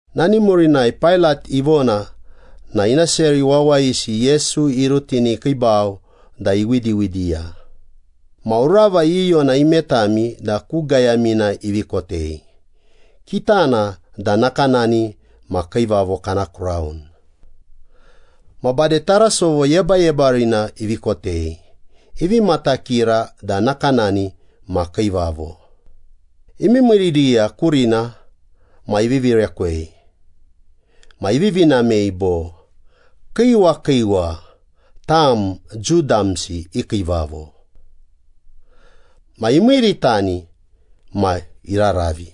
Nani murinai Pailat ivona na ina seri wawayisi Yesu irutini ikiibau da iwidiwidiya. Ma urava iyiyona imetami da ku gayamina ivi kotei, kitana da nakanani ma kiivavo kana kraun. Ma bade tarasovo yebayebarina ivi kotei, ivi matakira da nakanani ma kiivavo. Imiimiiriya kurina ma ivivi rekwei ma ivivi namei bo, “Kiiwa kiiwa tam Jiu damsi i kiivavo.” Ma imiiritani ma iraravi.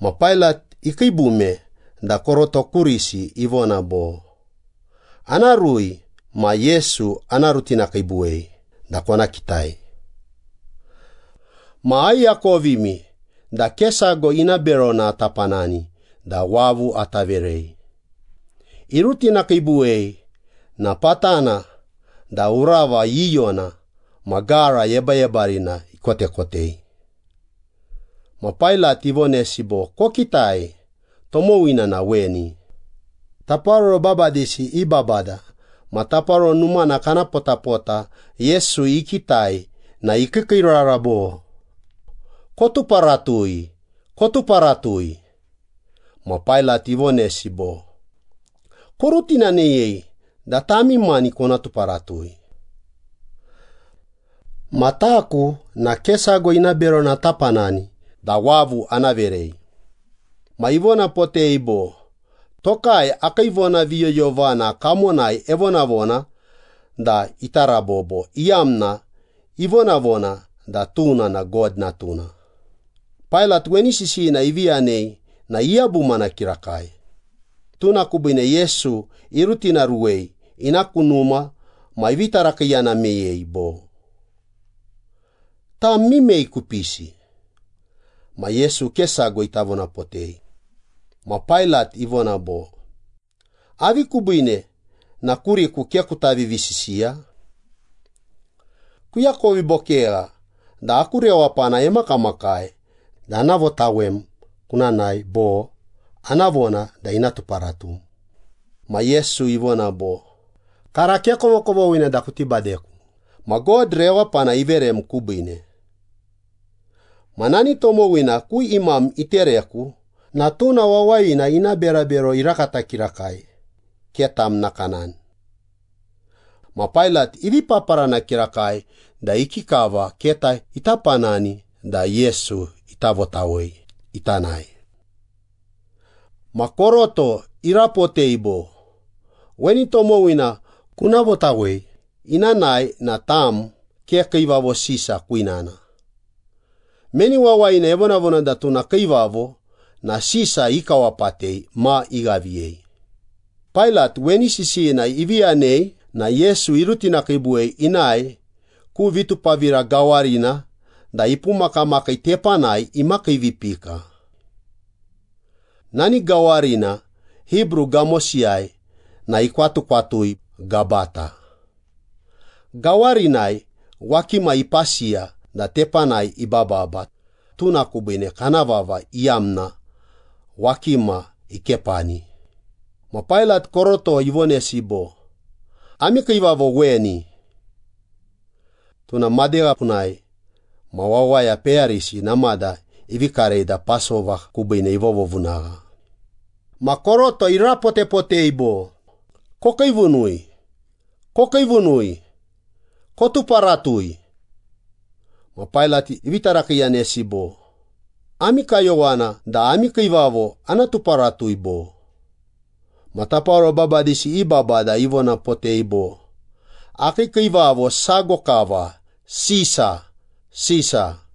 Ma Pailat ikiibume da koroto kurisi ivona bo, “Ana rui ma Yesu ana rutinakiibuwei da kona kitai. Ma aiakovimi da ke sago ina berona ata panani da wavu ata verei.” Irutinakiibuwei na patana da urava iyiyona ma gara yebayebarina ikotekotei. Ma Pailat ivonesi bo, “Kokitai, tomowina na weni.” Taparoro babadisi i babada ma taparoro numana kana potapota Yesu ikitai na ikiikiirara bo, “Kotuparatui! Kotuparatui!” Ma Pailat ivonesi bo, “Korutinaneyei da tami mani kona tuparatui. Ma taku na ke sago ina berona ata panani da wavu ana verei.” Ma ivonapotei bo, “Tokai akii vonaviyoyovana kamonai evonavona da ita rabobo, iyamna ivonavona da tuna na God Natuna.” Pailat weni sisiyina ivi yanei na iyabumana kirakai. Tuna kubiine Yesu irutinaruwei ina ku numa ma ivi tarakiiyana meyei bo, “Tam mimei kupisi?” Ma Yesu ke sago ita vonapotei. Ma Pailat ivona bo, “Avi kubiine na kuriku ke kuta vivisisiya? Kuakovi bo kegha da aku rewapana emakamakai da ana votawem kuna nae bo ana vona da ina tuparatum.” Ma Yesu ivona bo, “Kara ke kovokovoghina da kuti badeku, ma God rewapana iverem kubiine. Ma nani tomowina ku imam itereku na tuna wawayina ina berabero irakata kirakai, ke tam nakanani.” Ma Pailat ivi paparana kirakai da ikikava keta ita panani da Yesu ita votawei ita nae. Ma koroto irapotei bo, “Weni tomowina kuna votawei ina nae na tam ke Kiivavo Sisa kwinana. Meni wawayina evonavona da tuna kiivavo na Sisa ikawapatei ma ighaviyei.” Pailat weni sisiyina ivi yanei na Yesu irutinakiibuwei inae ku vitupavira gawarina da ipumakamakii tepanai imakiivipika. Nani gawarina Hibru gamosiyai na ikwatukwatui Gabata. Gawarinai wakima ipasiya da tepanai ibababa, tuna kubiine kana vava iyamna “Wakima ikepani.” Ma Pailat koroto ivonesi bo, “Ami kiivavo weni.” Tuna madegha punai ma wawaya peyarisi namada ivi karei da Pasova kubiine ivovovunagha. Ma koroto irapotepotei bo, “Kokiivunui! Kokiivunui! Kotuparatui!” Ma Pailat ivi tarakiiyanesi bo, “Ami kayowana da ami kiivavo ana tuparatui, bo?” Ma taparoro babadisi i babada ivonapotei bo, “Akii kiivavo sago kava. Sisa! Sisa!”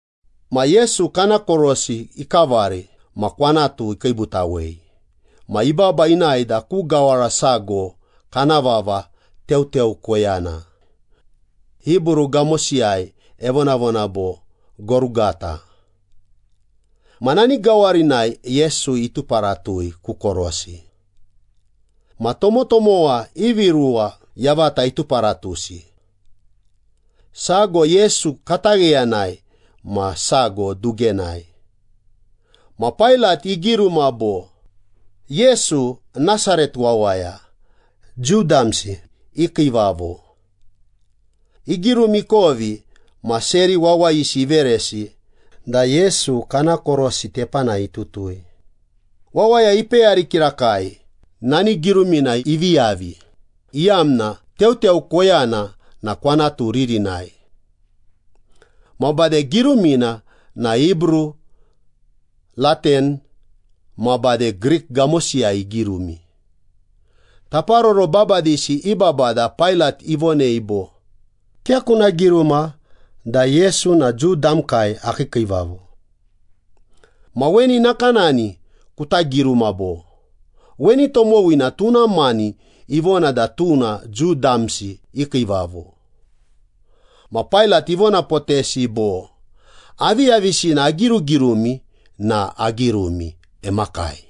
Ma Yesu kana korosi ikavari ma kwanatu ikiibutawei, ma ibaba inae da ku gawara sago kana vava ‘Teuteu Koyana.’ Hibru gamosiyai evonavona bo ‘Gorugata.’ Ma nani gawarinai Yesu ituparatui ku korosi. Ma tomotomowa ivi ruwa yavata ituparatusi. Sago Yesu katagheyanai ma sago dugenai. Ma Pailat igiruma bo, “Yesu, Nasaret wawaya, Jiu damsi i kiivavo.” Igirumi ikovi ma seri wawayisi iveresi da Yesu kana korosi tepanai itutui. Wawaya ipeyari kirakai nani girumina ivi yavi, iyamna Teuteu Koyana na kwanatu ririnai. Ma bade girumina na Hibru, Latin, ma bade Grik gamosiyai igirumi. Taparoro babadisi i babada Pailat ivonei bo, “Ke kuna giruma da Yesu na Jiu damkai akii kiivavo. Ma weni nakanani kuta giruma bo, ‘Weni tomowina tuna mani ivona da tuna Jiu damsi i kiivavo.’” Ma Pailat ivonapotesi bo, “Aviyavisina agirugirumi na agirumi. Emakai.”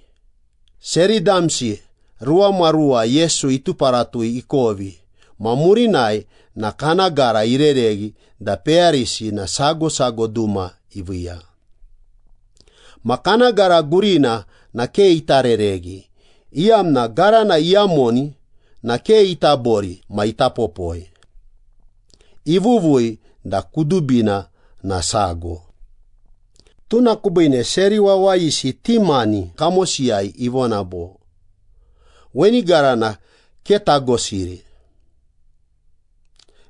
Seri damsi ruwamaruwa Yesu ituparatui ikovi ma murinai na kana gara irereghi da peyarisi na sago sago duma iviiya. Ma kana gara gurina na ke ita rereghi, iyamna garana iyamoni na ke ita bori ma ita popoi. Ivuvui da kudubina na sago. Tuna kubiine seri wawayisi ti mani kamosiyai ivona bo, “Weni garana ke tagosiri.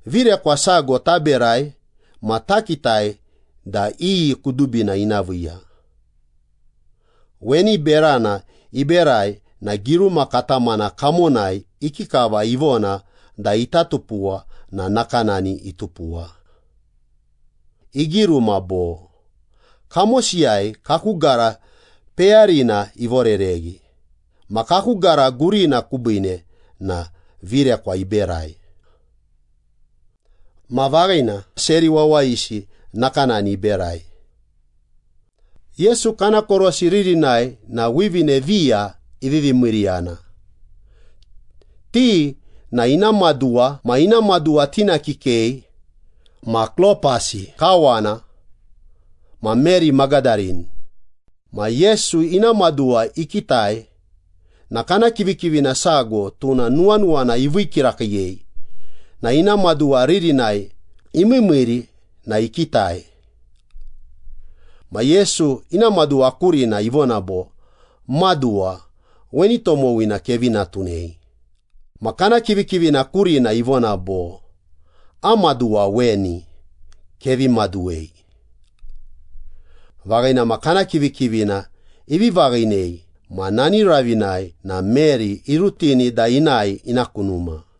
Virekwa sago taberai ma takitai da iyi kudubina ina viiya.” Weni berana iberai na giruma katamana kamonai ikikava ivona da ita tupuwa na nakanani itupuwa. Igiruma bo, “Kamosiyai kaku gara peyarina ivorereghi ma kaku gara gurina kubiine na virekwa iberai.” Ma vaghina, seri wawayisi nakanani iberai. Yesu kana korosi ririnai na wivine viya ivivi miiriyana. Ti na ina maduwa ma ina maduwa tina kikei, ma Klopasi kawana ma Meri Magadarini. Ma Yesu ina maduwa ikitai ma kana kivikivina sago, tuna nuwanuwana ivii kirakiiyei na ina maduwa ririnai imiimiiri na ikitai. Ma Yesu ina maduwa kurina ivona bo, “Maduwa, weni tomowina kevi natunei.” Ma kana kivikivina kurina ivona bo, “Am maduwa weni, kevi maduwei.” Vaghina ma, kana kivikivina ivi vaghinei ma nani ravinai na Meri irutini da inae ina ku numa.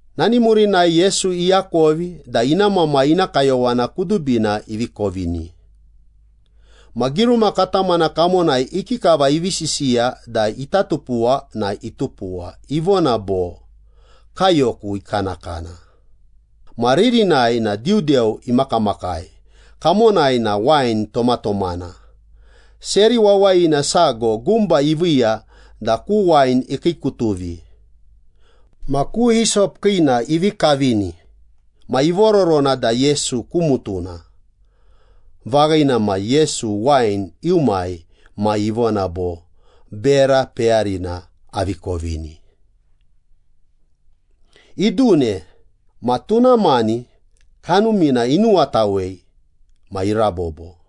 Nani murinai Yesu iakovi da ina Mamai ina kayowana kudubina ivi kovini. Ma giruma katamana kamonai ikikava ivi sisiya da ita tupuwa na itupuwa, ivona bo, “Kaiyoku ikanakana.” Ma ririnai na diudeu imakamakai, kamonai na wain tomatomana. Seri wawayina sago gumba iviiya da ku wain ikiikutuvi. Ma ku hisop kiina ivi kavini ma ivororona da Yesu ku mutuna. Vaghina ma, Yesu wain iumai ma ivona bo, “Bera peyarina avi kovini.” Idune ma tuna mani kanumina inuwatawei ma irabobo.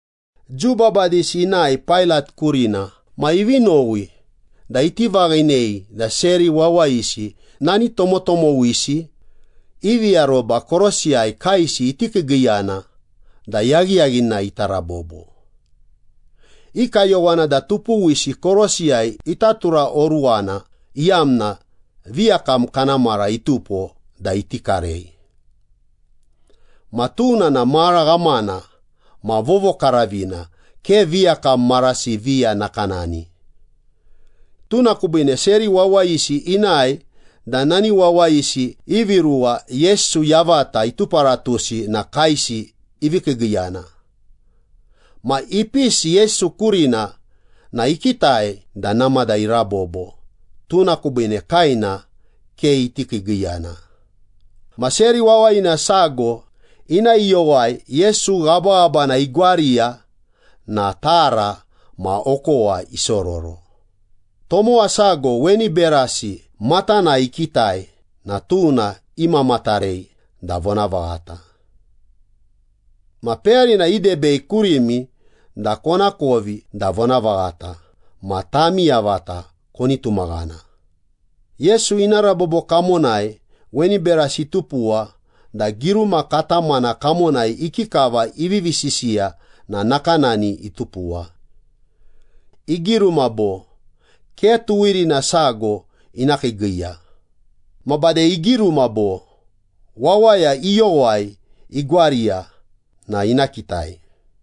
Jiu babadisi inae Pailat kurina ma ivi nowi da iti vaghinei da seri wawayisi nani tomotomowisi ivi aroba korosiyai kaesi iti kiigiiyana da yaghiyaghinai ita rabobo. I kayowana da tupuwisi korosiyai ita turaoruwana, iyamna viyakam kana mara itupo da iti karei. Ma tuna na mara ghamana ma vovokaravina, ke viyakam marasi viya nakanani. Tuna kubiine seri wawayisi inae da nani wawayisi ivi ruwa Yesu yavata ituparatusi na kaesi ivi kiigiiyana. Ma ipisi Yesu kurina na ikitai da namada irabobo, tuna kubiine kaena ke iti kiigiiyana. Ma seri wawayina sago ina iyowai Yesu ghabaghabana igwariya na tara ma okowa isororo. Tomowa sago weni berasi matanai ikitai na tuna imamatarei da vonavaghata. Ma peyarina idebei kurimi da konakovi da vonavaghata ma tami yavata koni tumaghana. Yesu ina rabobo kamonai weni berasi itupuwa da giruma katamana kamonai ikikava ivivi sisiya na nakanani itupuwa. Igiruma bo, “Ke tuwirina sago ina kiigiiya.” Ma bade igiruma bo, “Wawaya iyowai igwariya na ina kitai.”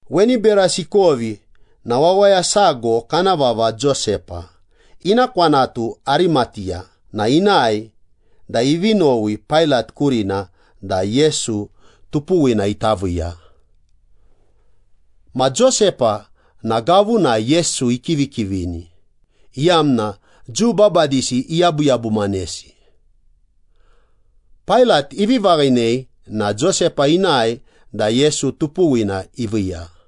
Weni berasi ikovi na wawaya sago kana vava Josepa, ina kwanatu Arimateya na inae da ivi nowi Pailat kurina da Yesu tupuwina ita viiya. Ma Josepa na gavunai Yesu ikivikivini, iyamna Jiu babadisi iyabuyabumanesi. Pailat ivi vaghinei na Josepa inae da Yesu tupuwina iviiya.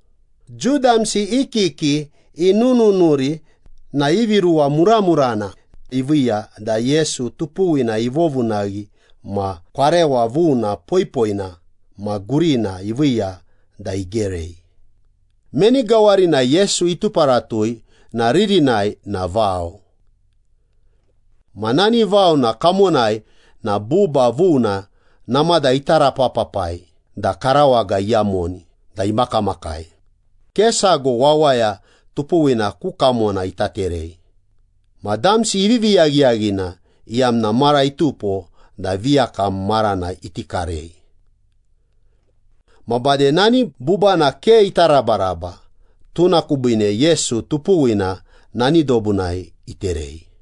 Jiu damsi i kiki inununuri na ivi ruwa muramurana iviiya da Yesu tupuwina ivovunaghi ma kwarewa vuna, poipoina ma gurina iviiya da igerei. Meni gawarina Yesu ituparatui na ririnai na vao. Ma nani vaona kamonai na buba vuna namada itarapapapai da karawaga iyamoni da imakamakai, ke sago wawaya tupuwina ku kamona ita terei. Ma damsi ivivi yaghiyaghina, iyamna mara itupo da viyakam marana iti karei. Ma bade nani bubana ke ita rabaraba, tuna kubiine Yesu tupuwina nani dobunai iterei.